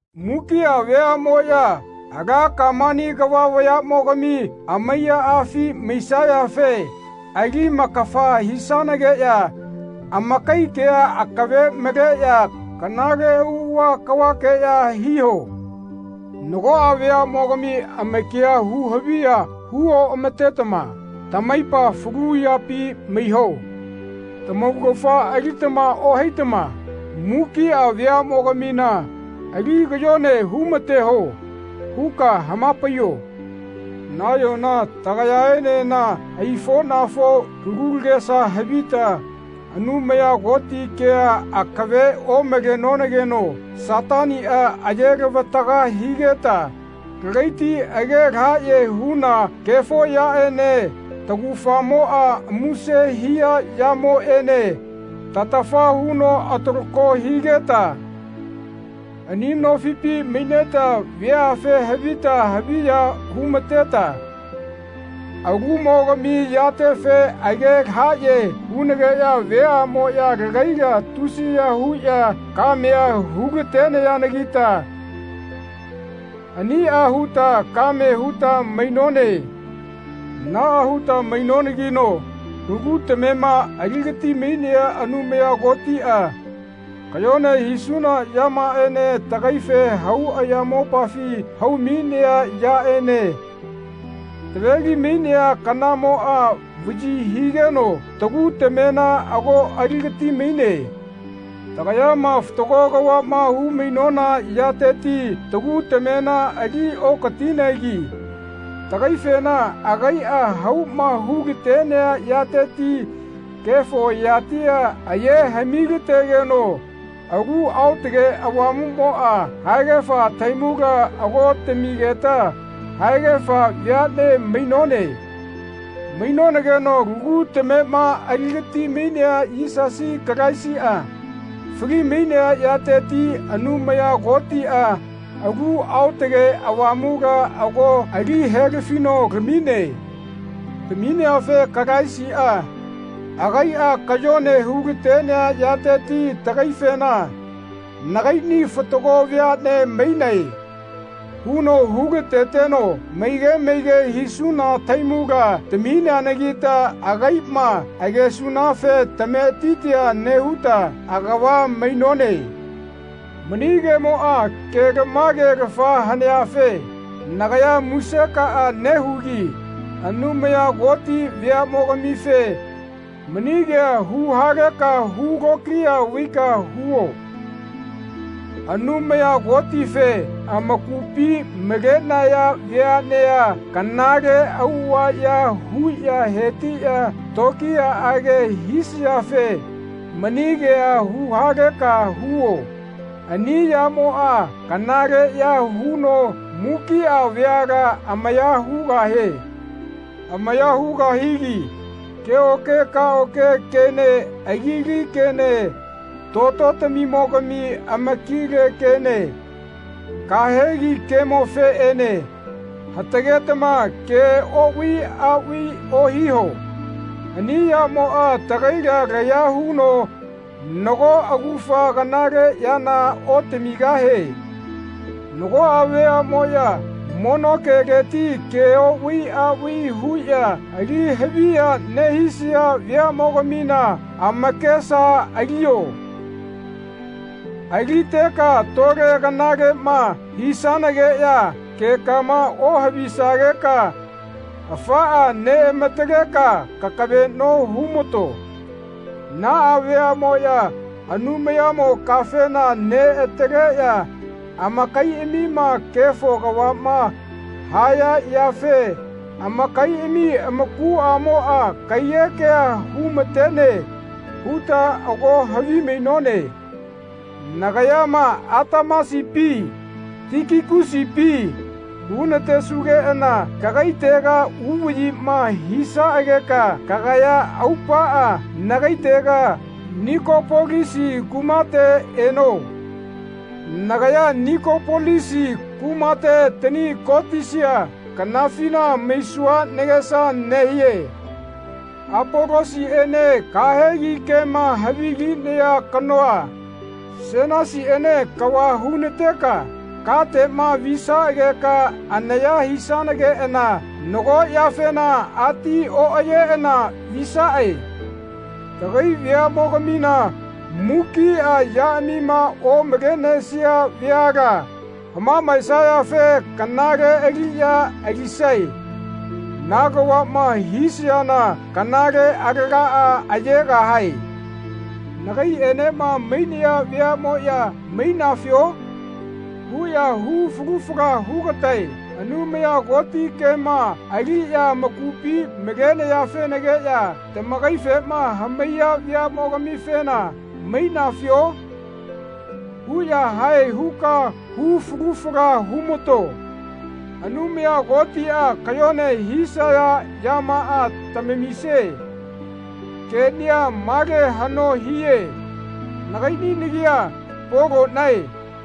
Mukia veamoya ala Kamani kava vayamogami amaiyaafi maisayafe ali-makafa hisanageya amakai kea akave maleya kanale auava kavakeya hiho. Nagoa veamogami amakia hu haviya hu oamatetama tamaipa falu yapi maiho. Tamaugafa alitama ohaitama mukia veamogamina ali kayone humateho. huka hamapaiyo. Nayona tagayaenena aifonafo lagu tagesa havita Anumaya Koti kea akave omalonageno Satania aye-lavataga higeta lagaiti age lahaye huna kefo yaene taugafamo muse hia yamoene tatafa huno atalako higeta ani nofipi maineta veafe havita haviya humateta alumogami yatefe age lahaye hunageya veamoya lagaila tusiya huya kamea hu-latenayanagita ania huta kame huta mainone. Naa huta mainonanagi lagu tamema aligati-mainea Anumaya Kotia kayone hisuna yamaaene tagaife hau ayamopafi hau-mainea yaene taveli-mainea kanamoa vayi higeno tagu tamena ago aligatimaine. Tagayama fatago kavama humainona yateti tagu tamena ali okatinegi tagaifena agaia hauma hulatenea yateti kefo yatia aye hami-lategeno Alu Aotage Avamumoa haegafa tahaimula ago tamigeta haegafa veane mainone. Mainonageno lagu tamema aligati-mainea Yisasi Kalaisia fali-mainea yateti Anumaya Kotia Alu Aotage Avamula ago ali helafino lamine. Tamineafe Kalaisia agaia kayone hulatenea yateti tagaifena Nagaini fatago veane mainae. huno hu-lateteno maige maige hisuna tahaimula tamineanagita agaima agesunafe tametitia nehuta agava mainone. Mani kemoa kelamagelafa haneafe nagaya musekaa nehugi Anumaya Koti veamogamife mani kea huhaleka hulokiya vaika huo. Anumaya Kotife amakupi malenaya veanea kanale auava ya huya hetiya tokiyaage hisayafe mani kea huhaleka huo. Ani yamoa kanaleya huno mukia veala amaya hugahie. Amaya hugahigi keoke kaoke kene agili kene tototamimo-gami amakile kene kahegi kemofeene hatagetama ke ovai avai ohiho. Ani yamoa tagaila laya huno nago augafa kanale yana otamigahie. Nagoa veamoya mono keleti ke ovai avai huya ali haviya nehisaya veamogamina amakesa alio. Aliteka tole kanalema hisanageya kekama ohavisageka afaa neamataleka kakaveno humato. Naa veamoya Anumayamo kafena neataleya amakaiamima kefo kavama haya yafe amakaiami amakuamoa kaiyekea humatene huta ago havimainone. Nagayama Atemasipi Tikikusipi hunatesugeana kagaitega uvayima hisaageka kagaya aupaa nagaitega Nikopolisi kumate eno. Nagaya Nikopolisi kumate tani kotisia kanafina maisua nagesa nehie. Apolosiene kahegi kema havilinea kanoa Senasiene kava hunateka katema visaageka anaya hisanageana nago yafena ati oayeana visae. Tagai veamogamina mukia yaamima omalenesia veala hamamaesayafe kanale aliya alisae. Na kavama hisayana kanale alagaa ayegahae. Nagaienema mainaya veamoya Mainafio? huya hu falu fala hugatae. Anumaya Koti kema aliya amakupi malenayafenagiya tagaifema hamaiya veamo-gamifena Mainafio? huya hae huka hu falu fala humato. Anumaya Kotia kayone hisaya yamaa tamamisie. Kenia male hano hie. Nagaini nagia Polonae.